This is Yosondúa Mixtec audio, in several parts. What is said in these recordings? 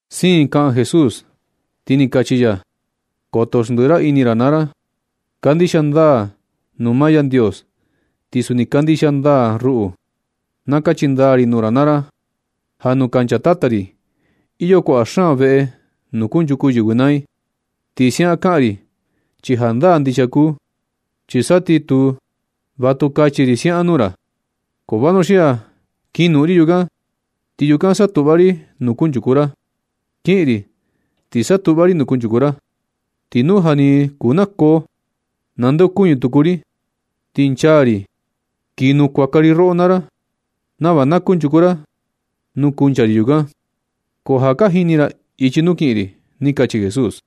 Siin kaꞌan Jesús, ti ni kachi ya: ―Koto xndiꞌi ra ini ra naa ra. Kandixia ndaa nuu maa Yandios. Ti suni kandixia ndaa ruꞌu. Na kachi ndaa ri nuu ra naa ra ja nuu kancha Tata ri, iyo kuaꞌa xaan veꞌe nuu kunchuku yɨvɨ naa i. Ti siaꞌan kaꞌan ri chi jandaa ndixia kuu. Chi sa ti tu, va tu kachi ri siaꞌan nuu ra. Ko vanuxia kin noꞌon ri yukan, ti yukan satuꞌva ri nuu kunchuku ra. Kiꞌin ri ti satuꞌva ri nuu kunchuku ra. Ti nu ja ni kuu nakoo, nandeokuñɨ tuku ri ti nchaa ri kii nukuaka ri roꞌo naa ra, nava na kunchuku ra nuu kuncha ri yukan. Ko ja ka jini ra ichi nuu kiꞌin ri ―ni kachi Jesús.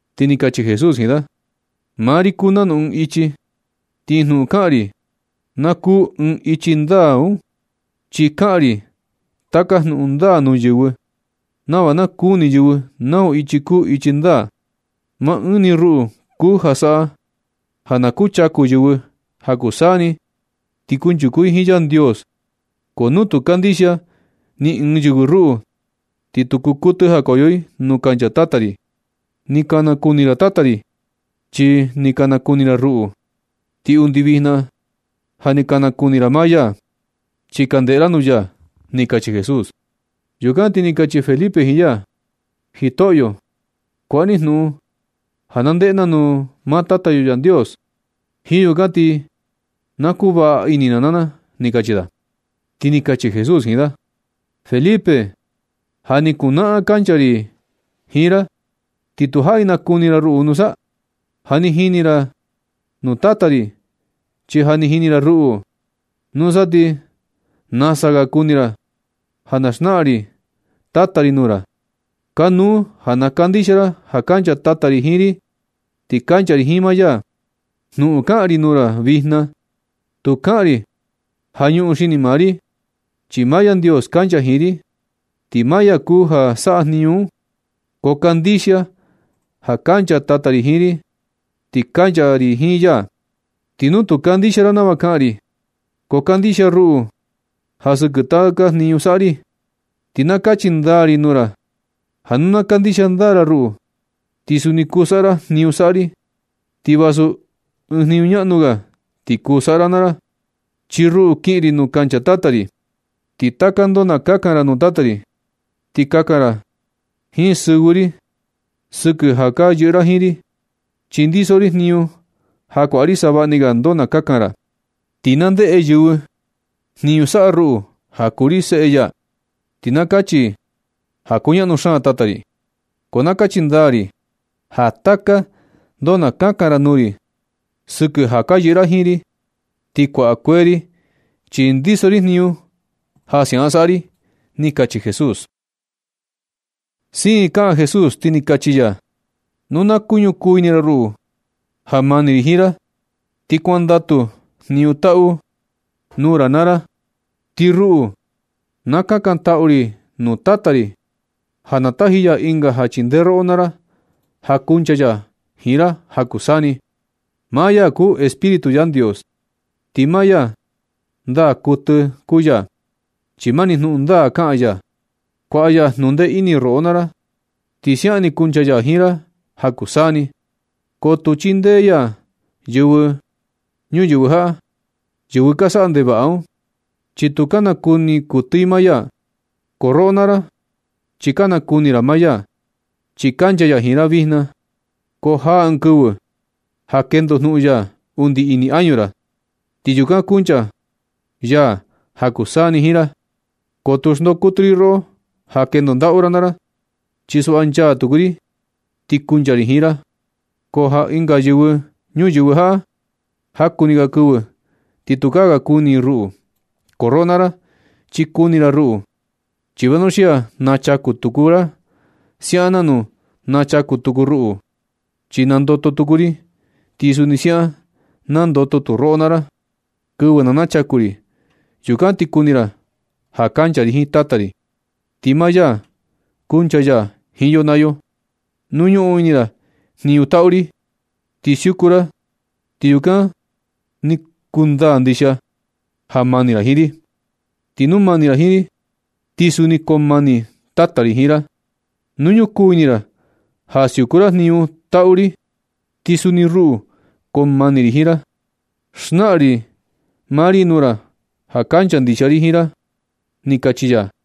Ti ni kachi Jesús jiin da: ―Maa ri kuu nanu ɨɨn ichi, ti jnuꞌun kaꞌan ri na kuu ɨɨn ichi ndaa un, chi kaꞌan ri taka jnuꞌun ndaa nuu yɨvɨ, nava na kuni yɨvɨ nau ichi kuu ichi ndaa. Maa ɨɨn ni ruꞌu kuu ja saꞌa ja na kuchaku yɨvɨ ja kuu saa ni, ti kunchuku i jiin Yandios. Ko nu tu kandixia ni ɨɨn yɨvɨ ruꞌu, ti tu kuu kuɨtɨ jakoyo i nuu kancha Tata ri. Ni ka nakuni ra Tata ri chi ja ni ka nakuni ra ruꞌu. Ti undi vijna ja ni ka nakuni ra maa ya, chi ka ndeꞌe ra nuu ya ―ni kachi Jesús. Yukan ti ni kachi Felipe jiin ya: ―Jitoꞌyo, kuaꞌa ni jnuꞌun ja na ndeꞌe na nuu maa Tata yo Yandios. Jiin yukan ni ti na kuvaꞌa ini na naa na ―ni kachi da. Ti ni kachi Jesús jiin da: ―Felipe, ja ni kuu naꞌan kancha ri jiin ra ¿ti tu jaꞌi nakuni ra ruꞌu nusa? Ja ni jini ra nuu Tata ri, chi ja ni jini ra ruꞌu. Nusa ti nasa ga kuni ra ja na xnaꞌan ri Tata ri nuu ra. Kanuu ja na kandixia ra ja kancha Tata ri jiin ri, ti kancha ri jiin maa ya. Jnuꞌun kaꞌan ri nuu ra vijna, tu kaꞌan ri ja ñuꞌun xini maa ri, chi maa Yandios kancha jiin ri, ti maa ya kuu ja saꞌa jniñu un. Ko kandixia ja kancha Tata ri jiin ri, ti kancha ri jiin ya. Ti nu tu kandixia ra nava kaꞌan ri, ko kandixia ruꞌu ja sɨkɨ taka jniñu saꞌa ri. Ti na kachi ndaa ri nuu ra naa ra ja nu na kandixia ndaa ra ruꞌu, ti suni kuu saꞌa ra jniñu saꞌa ri, ti vasu ɨɨn jniñu ñaꞌnu ga, ti kuu saꞌa ra naa ra. Chi ruꞌu, kiꞌin ri nuu kancha Tata ri. Ti taka ndoo na kakan ra nuu Tata ri, ti kakan ra jiin sɨvɨ ri sɨkɨ ja ka yɨꞌɨ ra jiin ri. Chi ndiso ri jniñu ja kuaꞌa ri savaꞌa ni ga ndoo na kakan ra. Ti na ndeꞌe yɨvɨ jniñu saꞌa ruꞌu, ja kuu ri seꞌe ya, ti na kachi i ja kuñaꞌnu xaan Tata ri. Ko na kachi ndaa ri ja taka ndoo na kakan ra nuu ri sɨkɨ ja ka yɨꞌɨ ra jiin ri ti kuaꞌa kueꞌe ri, chi ndiso ri jniñu ja siaꞌan saꞌa ri ―ni kachi Jesús Siin kaꞌan Jesús, ti ni kachi ya: ―Nu ka ñukuu ini ra ruꞌu ja mani ri jiin ra, ti kuandatu jniñu taꞌu nuu ra naa ra. Ti ruꞌu, na kakantaꞌu ri nuu Tata ri ja na taji ya Ɨnga ja chindee roꞌo naa ra, ja kuncha ya jiin ra ja kuu saa ni. Maa ya kuu Espíritu Yandios, ti maa ya ndaa kuɨtɨ kuu ya. Chi mani jnuꞌun ndaa kaꞌan ya. Kuaꞌa ya jnundee ini roꞌo naa ra, ti siaꞌan ni kuncha ya jiin ra ja kuu saa ni. Ko tu chindee ya yɨvɨ ñuyɨvɨ jaꞌa, yɨvɨ ka saꞌa ndevaꞌa un, chi tu ka nakuni kuɨtɨ i maa ya. Ko roꞌo naa ra chi ka nakuni ra maa ya, chi kancha ya jiin ra vijna. Ko jaa ɨɨn kɨvɨ ja kendoꞌo jnuꞌun ya undi ini añu ra, ti yukan kuncha ya ja kuu saa ni jiin ra. Ko tu xndoo kuɨtɨ ri roꞌo ja kendo ndaꞌu ra naa ra. Chi suꞌva, nchaa tuku ri ti kuncha ri jiin ra. Ko ja ɨnga yɨvɨ ñuyɨvɨ jaꞌa, jaku ni ga kɨvɨ ti tukaa ga kuni i ruꞌu. Ko roꞌo naa ra, chi nakuni ra ruꞌu, chi vanuxia nachaku tuku ra siaꞌan nanu nachaku tuku ruꞌu. Chi nandoto tuku ri, ti suni siaꞌan nandoto tu roꞌo naa ra. Kɨvɨ na nachaku ri, yukan ti kuni ra ja kancha ri jiin Tata ri, ti maa ya kunchaa ya jiin yo naa yo. Nu ñuꞌun ini ra jniñu taꞌu ri ti siuku ra, ti yukan ni kundaa ndixia ja mani ra jiin ri. Ti nu mani ra jiin ri, ti suni koo mani Tata ri jiin ra. Nu ñukuu ini ra ja siuku ra jniñu taꞌu ri, ti sa ni ruꞌu koo mani ri jiin ra. Naxnaꞌan ri maa ri nuu ra ja kancha ndixia ri jiin ra ―ni kachi ya.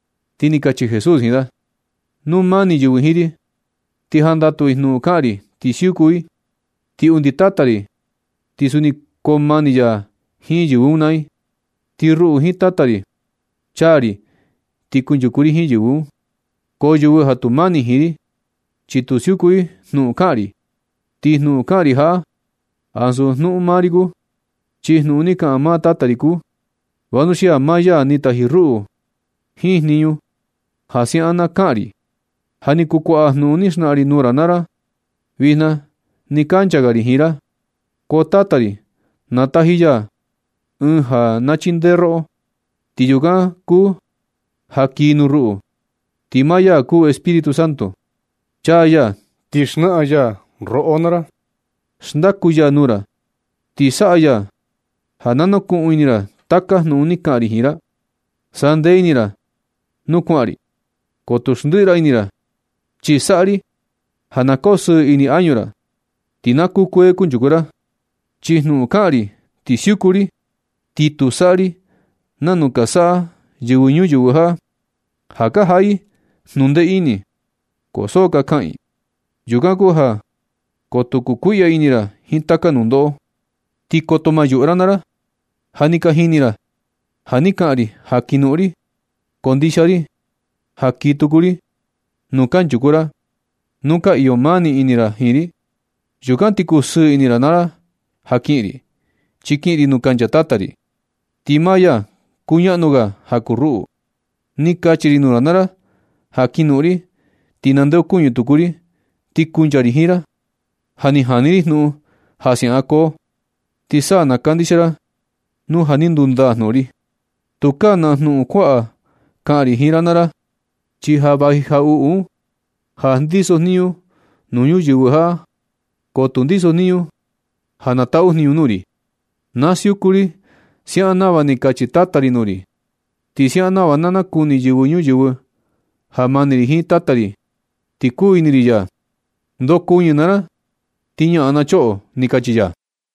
Ti ni kachi Jesús jiin da: ―Nu mani yɨvɨ jiin ri, ti jandatu i jnuꞌun kaꞌan ri ti siuku i. Ti undi Tata ri ti suni koo mani ya jiin yɨvɨ un naa i. Ti ruꞌu jiin Tata ri, chaa ri ti kunchuku ri jiin yɨ. Ko yɨvɨ ja tu mani jiin ri, chi tu siuku i jnuꞌun kaꞌan ri. Ti jnuꞌun kaꞌan ri jaꞌa, ansu jnuꞌun maa ri kuu. Chi jnuꞌun ni kaꞌan maa Tata ri kuu, vanuxia maa ya ni taji ruꞌu jiin jniñu ja siaꞌan na kaꞌan ri. Ja ni kuu kuaꞌa jnuꞌun ni xnaꞌan ri nuu ra naa ra vijna nɨ kancha ga ri jiin ra. Ko Tata ri na taji ya Ɨɨn ja na chindee roꞌo. Ti yukan kuu ja kii nuu ruꞌu, ti maa ya kuu Espíritu Santo. Chaa ya ti xnaꞌan ya roꞌo naa ra, xndaku ya nuu ra, ti saꞌa ya ja na nukuꞌun ini ra taka jnuꞌun ni kaꞌan ri jiin ra. Sandee ini ra nuu kuaꞌan ri, ko tu xndiꞌi ra ini ra, chi saꞌa ri ja na kosɨɨ ini añu ra, ti na kukuee kunchuku ra. Chi jnuꞌun kaꞌan ri ti siuku ri, ti tu saꞌa ri nanu ka saꞌa yɨvɨ ñuyɨvɨ jaꞌa, ja ka jaꞌa i jnundee ini, ko so ka kaꞌan i. Yukan kuu ja koto kukuiꞌya ini ra jiin taka nundoꞌo, ti koto ma yuꞌu ra naa ra. Ja ni ka jini ra ja ni kaꞌan ri ja kin noꞌon ri, ko ndixia ri ja kii tuku ri nuu kanchuku ra nu ka iyo mani ini ra jiin ri. Yukan ti kusɨɨ ini ra naa ra ja kiꞌin ri, chi kiꞌin ri nuu kancha Tata ri. Ti maa ya kuñaꞌnu ga ja kuu ruꞌu. Ni kachi ri nuu ra naa ra ja kin noꞌon ri, ti ndeocuñɨ tuku ri ti kuncha ri jiin ra. Ja ni jani ri jnuꞌun ja siaꞌan koo. Ti sa na kandixia ra nu ja ni kundaa jnuꞌun ri. Tukaa na jnuꞌun kuaꞌa kaꞌan ri jiin ra naa ra, chi ja vaji jaꞌuꞌu un ja ndiso jniñu nuu yɨvɨ ñuyɨvɨ jaꞌa. Ko tu ndiso jniñu ja nataꞌu jniñu nuu ri. Na siukun ri siaꞌan nava ni kachi Tata ri nuu ri. Ti siaꞌan nava na nakuni yɨvɨ ñuyɨvɨ ja mani ri jiin Tata ri ti kuu ini ri ya. Ndokuñɨ naa ra, ti ñaꞌan na choꞌo ―ni kachi ya.